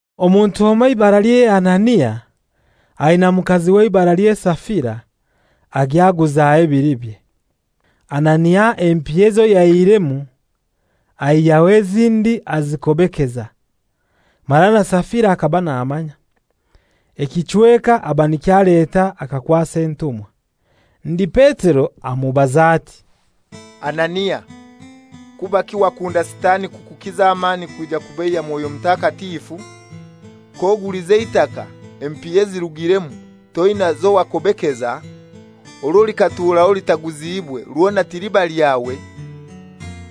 Omuntu omoi eibaralye Anania, aina mukaziwe eibaralye Safira, agya aguzaho ebilibye. Anania empiya ezo yaihiremu aihyaho ezindi azikobekeza, mara na Safira akaba namanya. Ekichweka aba nikyo aleta akakwasa entumwa. Ndi Petero amubaza ati, «Anania, kubaki wakunda Sitani kukukiza amani kwija kubeiya Mwoyo Mutakatifu? K'ogulize eitaka, empiya ezirugiremu toina zowakobekeza? Orwo likatuuraho litaguziibwe rwona tiliba lyawe?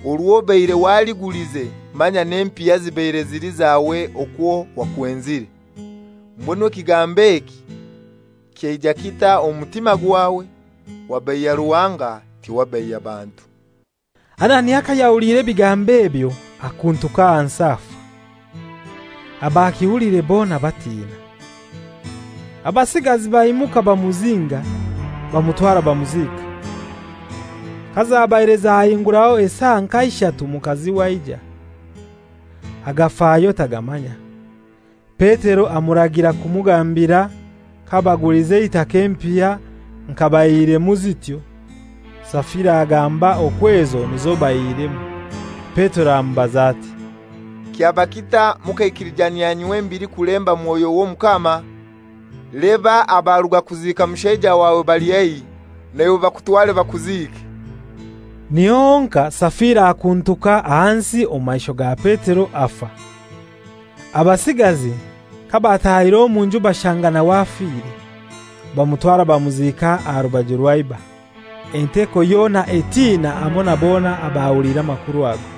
Orwo obaire waligulize manya n'empiya zibaire zili zawe okwo wakwenzire! Mbwenu ekigambo eki kyaija kitai omu mutima gwawe? Wabeiya Ruhanga, tiwabeiya bantu.» Anania kayahuliire ebigambo ebyo akuntuka ahansi afa. Abakihuliire bona batina. Abasigazi baimuka bamuzinga, bamutwara bamuziika. Kazabaire zahinguraho esaa nka ishatu mukaziwe aija. Agafayo tagamanya. Petero amuragira kumugambira kabagulize eitaka empiya nka baihiremu zityo. Safira agamba okwo ezo nizo baihiremu. Petero amubaza ati, «Kyaba kitai mukaikilijanyia nywembili kulemba Mwoyo w'Omukama? Leba abaruga kuziika mushaija wawe bali haihi. Naiwe bakutware bakuziike.» Niho honkai Safira akuntuka ahansi omu maisho ga Petero afa. Abasigazi kabatahire omu nju bashanga nawe afire, bamutwara bamuziika aha rubaju rwa iba. Enteko yona etina hamoi na bona abahuliire amakuru ago.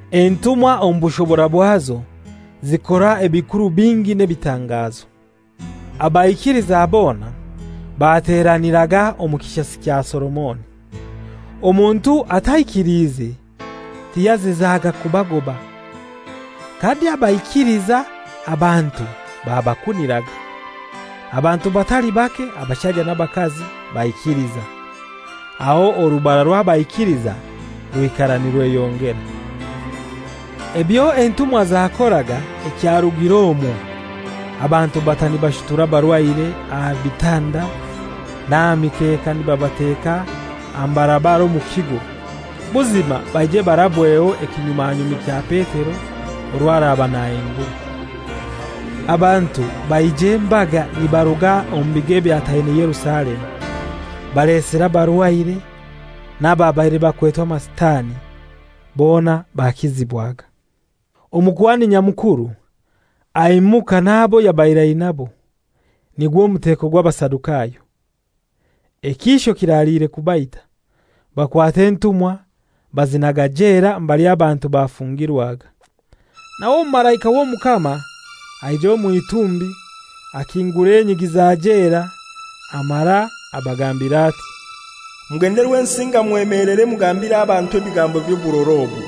Entumwa omu bushobora bwazo zikora ebikuru bingi n'ebitangazo. Abaikiliza bona bateraniraga omu Kishasi kya Solomoni. Omuntu ataikiliize tiyazizaga kubagoba. Kandi abaikiliza abantu babakuniraga. Abantu batali bake abashaija n'abakazi, baikiliza, aho orubara rw'abaikiliza rwikara nirweyongera. Ebyo entumwa zakoraga ekyarugire omwo abantu bata nibashutura abarwaire aha bitanda n'aha mikeka nibabateka aha mbarabara omu kigo, buzima baije barabweho ekinyumanyumi kya Petero orwo araba nahingura. Abantu baija embaga nibaruga omu bigo ebyataine Yerusalemu, balesire abarwaire n'ababaire bakwetwe amasitani. Bona bakizibwaga. Omukuhani Nyamukuru aimuka n'abo yabaire ainabo, nigwo muteko gw'Abasadukayo, ekiisho kiraliire kubaita, Bakwata entumwa bazinaga jela mbali abantu bafungirwaga. Nawe omumalaika w'Omukama aija omw'itumbi, akingura enyigi za jela, amara abagambira ati, «Mugende Rwensinga mwemelere mugambire abantu ebigambo by'oburora obu.»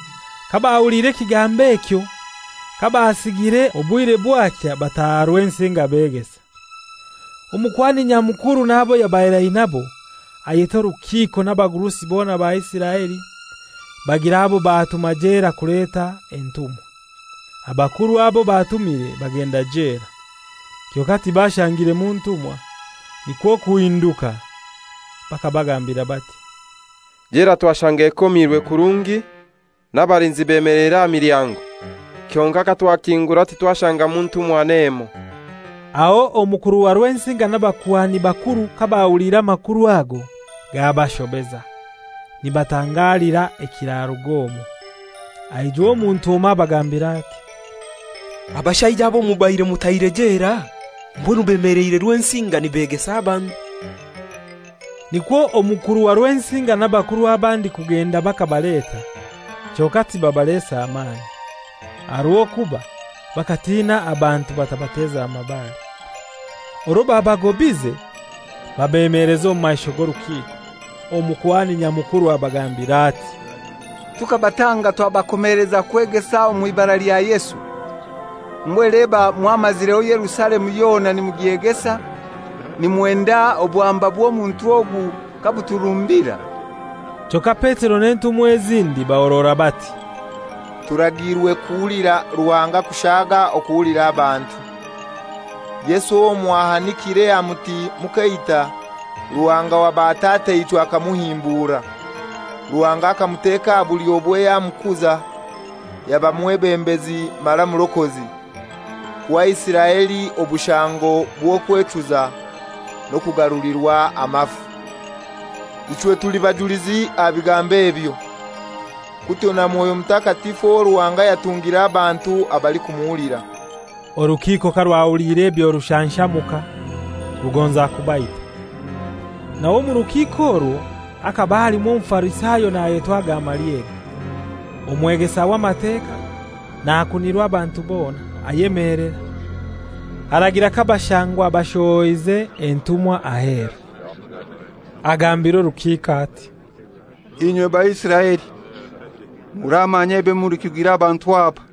Kabahuliire ekigambo ekyo kabasigire obwire bwakya bataha Rwensinga beegesa. Omukuhani Nyamukuru n'abo yabaire ainabo ayeta orukiiko n'abagurusi bona ba Isiraeli, bagira abo batuma jela kuleta entumwa. Abakuru abo batumire bagenda jela, kyonkai tibashangiremu ntumwa. Nikwo kuhinduka bakabagambira bati, «Jela twashanga ekomirwe kurungi, n'abalinzi bemeleire aha milyango, kyonkai katwagikingura titwashangamu ntumwa n'emoi.» Aho omukuru wa Rwensinga n'abakuhani bakuru kabahuliire amakuru ago gabashobeza, nibatangalira ekiraruga omwo. Aijwa omuntu omoi abagambira ati, «Abashaija abo mubaire mutaire jela mbwenu bemeleire Rwensinga nibeegesa abantu.» Nikwo omukuru wa Rwensinga n'abakuru abandi kugenda bakabaleta, kyonkai tibabalesa mani, aha rw'okuba bakatina abantu batabateza mabare. Orwo babagobaize, babemeleza omu maisho g'orukiiko. Omukuhani Nyamukuru abagambira ati, «Tukabatanga twabakomeleza kutegesa mw'ibara lya Yesu, mbwenu leba mwamazireho Yerusalemu yona nimugyegesa, nimwenda obwamba bw'omuntu ogu kabuturumbira.» Kyonkai Petero n'entumwa ezindi bahorora bati, «Turagiirwe kuhulira Ruhanga kushaaga okuhulira abantu. Yesu owo mwahanikire aha muti mukaita, Ruhanga wa batataichwe akamuhimbura. Ruhanga akamuteka aha bulyobwe yamukuza, yaba mwebembezi mara Mulokozi, kuha Isiraeli obushango bw'okwechuza n'okugarulirwa amafu. Ichwe tuli bajulizi aha bigambo ebyo, kutyo na Mwoyo Mutakatifu owo Ruhanga yatungire abantu abalikumuhulira.» Orukiiko karwahuliire ebyo rushanshamuka, rugonza kubaita. Nawe omu rukiiko orwo hakaba halimu Omufarisayo nayetwa Gamalieli, omwegesa w'Amateka, nakunirwa abantu bona, ayemelera, aragira kabashangwa bashohoize entumwa aheru. Agambira orukiiko ati, «Inywe Baisiraeli, muramanya ebyo mulikugira abantu aba.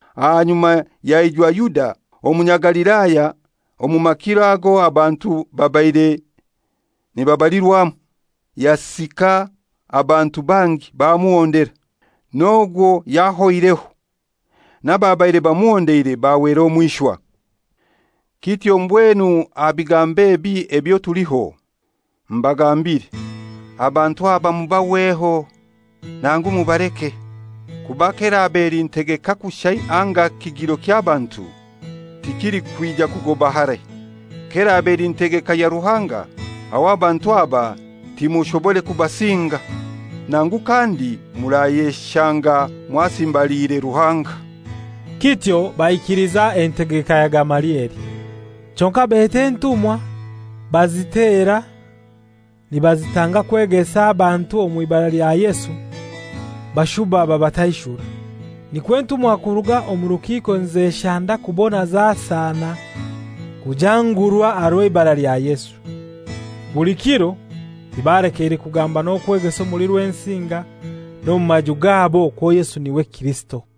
Ahanyuma yaijwa Yuda Omunyagalilaya omu makiro ago abantu babaire nibabalirwamu, yasika abantu bangi bamuhondera; n'ogwo yahoireho, n'ababaire bamuhondeire bahwera omw'ishwa. Kityo mbwenu aha bigambo ebi ebyo tuliho, mbagambire, abantu aba mubahweho, nangu mubaleke. Kuba k'eraba eli ntegeka kushai anga kigiro ky'abantu, tikilikwija kugoba harai. K'eraba eli ntegeka ya Ruhanga, aho abantu aba timushobore kubasinga. Nangu kandi murayeshanga mwasimbaliire Ruhanga!» Kityo baikiliza entegeka ya Gamalieli. Kyonkai beta entumwa bazitera nibazitanga kwegesa abantu omw'ibara lya Yesu, bashuba babataishura. Nikwo entumwa kuruga omu rukiiko nizeshanda kubona zasana kujangurwa aha rw'eibara lya Yesu. Buli kiro tibalekeire kugamba n'okwegesa omuli Rwensinga n'omu maju gabo okwo Yesu n'iwe Kirisito.